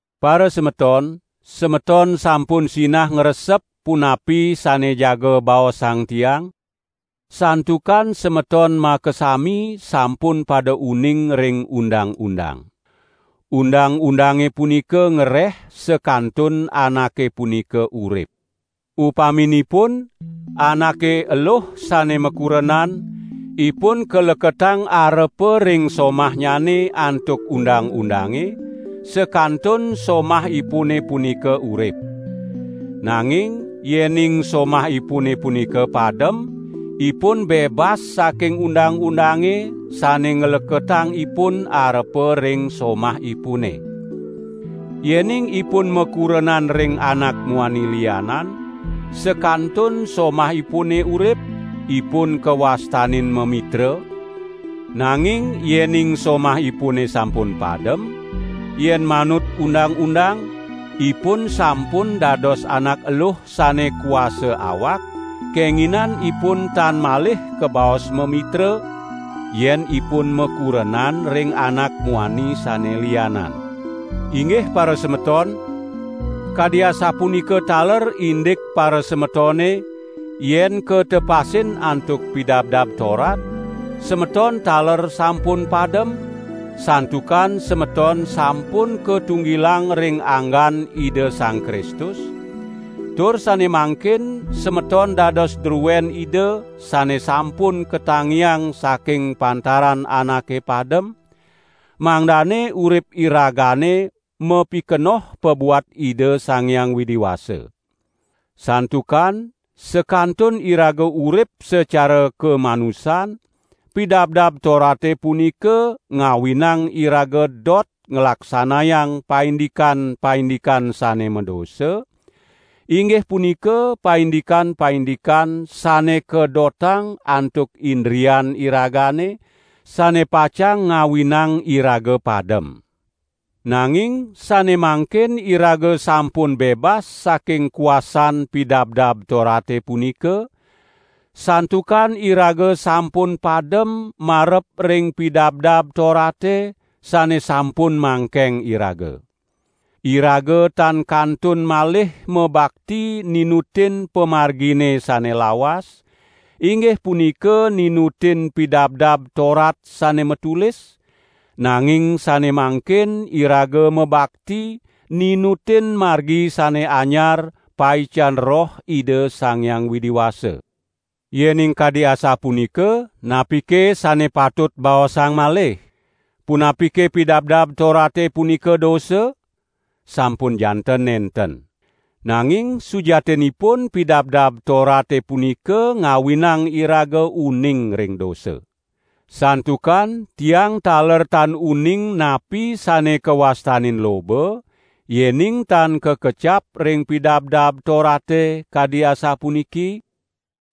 Parasemeton, semeton sampun sinah ngresep punapi sane jaga baosang tiang, santukan semeton makasami sampun pada uning ring undang-undang. Undang-undange punika ngreh sakantun anake punika urip. Upaminipun, anake eluh sane makurenan, ipun kaleketang arepa ring somahnyane antuk undang-undange, sakantun somahipune punika urip. Nanging yening somahipune punika padem, ipun bebas saking undang-undange sane ngleketang ipun arepa ring somahipune. Yening ipun makurenan ring anak muani lianan, sakantun somahipune urip, ipun kawastanin mamitra; nanging yening somahipune sampun padem, yen manut undang-undang, ipun sampun dados anak eluh sane kuasa awak, kenginan ipun tan malih kabaos mamitra, yen ipun makurenan ring anak muani sane lianan. Inggih parasemeton, kadi asapunika taler indik parasemetone, yen katepasin antuk Pidabdab Torat, semeton taler sampun padem, santukan semeton sampun katunggilang ring anggan Ida Sang Kristus; tur sane mangkin semeton dados druen Ida sane sampun katangiang saking pantaran anake padem, mangdane urip iragane mapikenoh pabuat Ida Sang Hyang Widi Wasa. Santukan sakantun iraga urip sacara kamanusan, Pidabdab Torate punika ngawinang iraga dot nglaksanayang paindikan-paindikan sane madosa, inggih punika paindikan-paindikan sane kadotang antuk indrian iragane, sane pacang ngawinang iraga padem. Nanging sane mangkin iraga sampun bebas saking kuasan Pidabdab Torate punika, santukan iraga sampun padem marep ring Pidabdab Torate sane sampun mangkeng iraga. Iraga tan kantun malih mabakti ninutin pamargine sane lawas, inggih punika ninutin Pidabdab Torat sane matulis, nanging sane mangkin iraga mabakti ninutin margi sane anyar paican Roh Ida Sang Hyang Widi Wasa. Yening kadi asapunika, napike sane patut baosang malih? Punapike Pidabdab Torate punika dosa? Sampun janten nenten. Nanging sujatinipun Pidabdab Torate punika ngawinang iraga uning ring dosa. Santukan tiang taler tan uning napi sane kawastanin loba, yening tan kakecap ring Pidabdab Torate kadi asapuniki: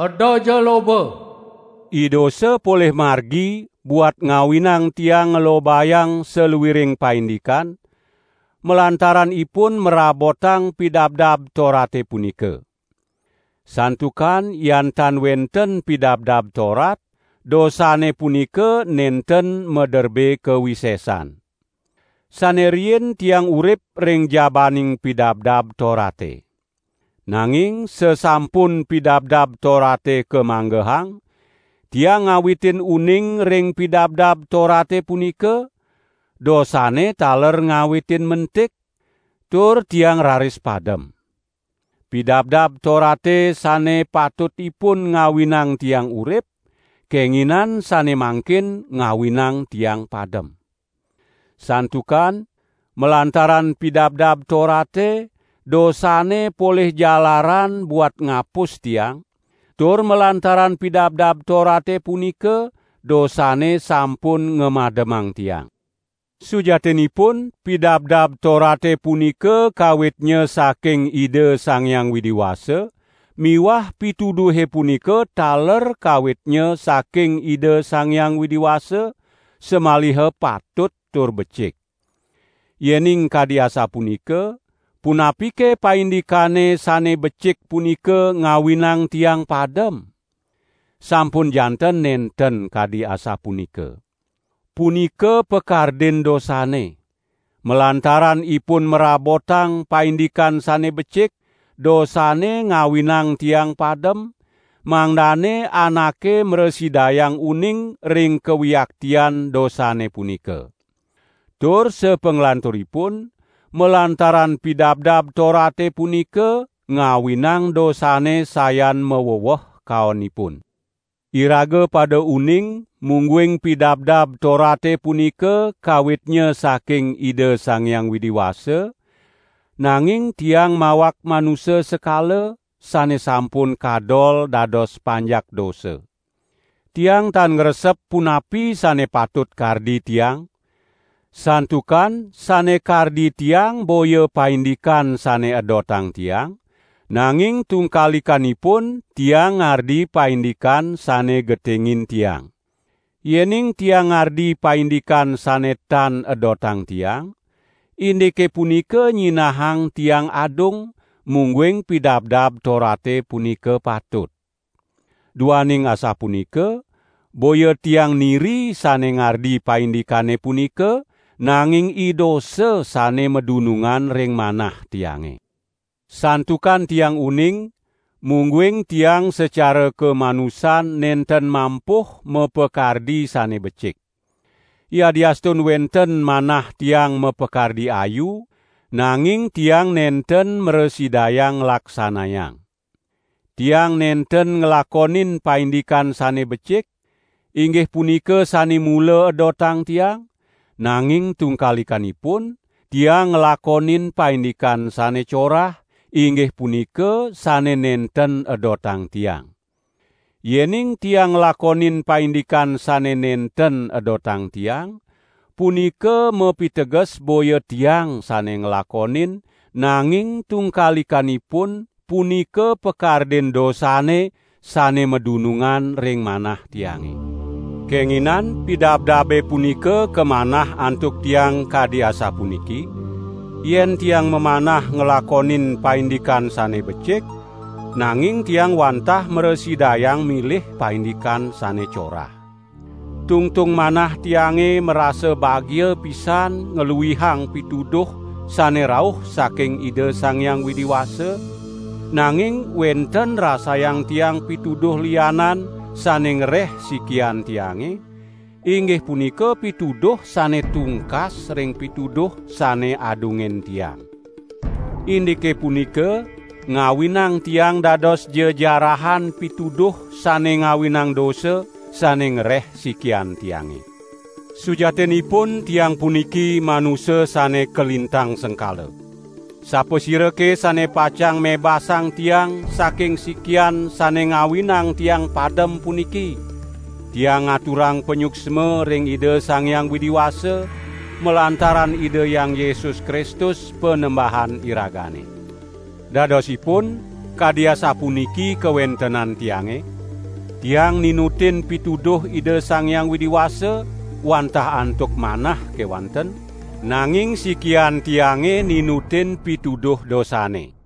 "Edaja loba." Idosa polih margi buat ngawinang tiang nglobayang saluiring paindikan, malantaran ipun mrabotang Pidabdab Torate punika. Santukan yan tan wenten Pidabdab Torat, dosane punika nenten maderbe kawisesan. Sane riin tiang urip ring jabaning Pidabdab Torate. Nanging sasampun Pidabdab Torate kamanggehang, tiang ngawitin uning ring Pidabdab Torate punika, dosane taler ngawitin mentik, tur tiang raris padem. Pidabdab Torate sane patutipun ngawinang tiang urip, kenginan sane mangkin ngawinang tiang padem. Santukan, malantaran Pidabdab Torate dosane polih jalaran buat ngapus tiang; tur malantaran Pidabdab Torate punika dosane sampun ngamademang tiang. Sujatinipun Pidabdab Torate punika kawitnya saking Ida Sang Hyang Widi Wasa miwah pituduhe punika taler kawitnya saking Ida Sang Hyang Widi Wasa; samaliha patut tur becik. Yening kadi asapunika, punapike paindikane sane becik punika ngawinang tiang padem? Sampun janten nenten kadi asapunika. Punika pakardin dosane; malantaran ipun mrabotang paindikan sane becik, dosane ngawinang tiang padem, mangdane anake mrasidayang uning ring kawiaktian dosane punika. Tur sapanglanturipun, malantaran Pidabdab Torate punika ngawinang dosane sayan maweweh kaonipun. Iraga pada uning mungguing Pidabdab Torate punika kawitnya saking Ida Sang Hyang Widi Wasa, nanging tiang mawak manusa sekala, sane sampun kadol dados panjak dosa. Tiang tan ngresep punapi sane patut kardi tiang; santukan sane kardi tiang boya paindikan sane edotang tiang, nanging tungkalikanipun tiang ngardi paindikan sane getingin tiang. Yening tiang ngardi paindikan sane tan edotang tiang, indike punika nyinahang tiang adung, mungguing Pidabdab Torate punika patut. Duaning asapunika, boya tiang niri sane ngardi paindikane punika, nanging idosa sane madunungan ring manah tiange. Santukan tiang uning, mungguing tiang sacara kamanusan nenten mampuh mapakardi sane becik. Yadiastun wenten manah tiang mapakardi ayu, nanging tiang nenten mrasidayang nglaksanayang. Tiang nenten nglakonin paindikan sane becik, inggih punika sane mula edotang tiang, nanging tungkalikanipun tiang nglakonin paindikan sane corah, inggih punika sane nenten edotang tiang. Yening tiang nglakonin paindikan sane nenten edotang tiang, punika mapiteges boya tiang sane nglakonin, nanging tungkalikanipun punika pakardin dosane sane madunungan ring manah tiange. Kenginin pidabdabe punika kamanah antuk tiang kadi asapuniki. Yen tiang mamanah nglakonin paindikan sane becik, nanging tiang wantah mrasidayang milih paindikan sane corah. Tungtung manah tiange marasa bagia pisan ngluihang pituduh sane rauh saking Ida Sang Hyang Widi Wasa, nanging wenten rasayang tiang pituduh lianan sane ngreh sikian tiange, inggih punika pituduh sane tungkas ring pituduh sane adungin tiang. Indike punika ngawinang tiang dados jejarahan pituduh sane ngawinang dosa, sane ngreh sikian tiange. Sujatinipun tiang puniki manusa sane kalintang sengkala. Sapasirake sane pacang mebasang tiang saking sikian sane ngawinang tiang padem puniki? Tiang ngaturang panyuksma ring Ida Sang Hyang Widi Wasa, malantaran Ida Hyang Yesus Kristus, panembahan iragane. Dadosipun, kadi asapuniki kawentenan tiange: tiang ninutin pituduh Ida Sang Hyang Widi Wasa wantah antuk manah kewanten, nanging sikian tiange ninutin pituduh dosane.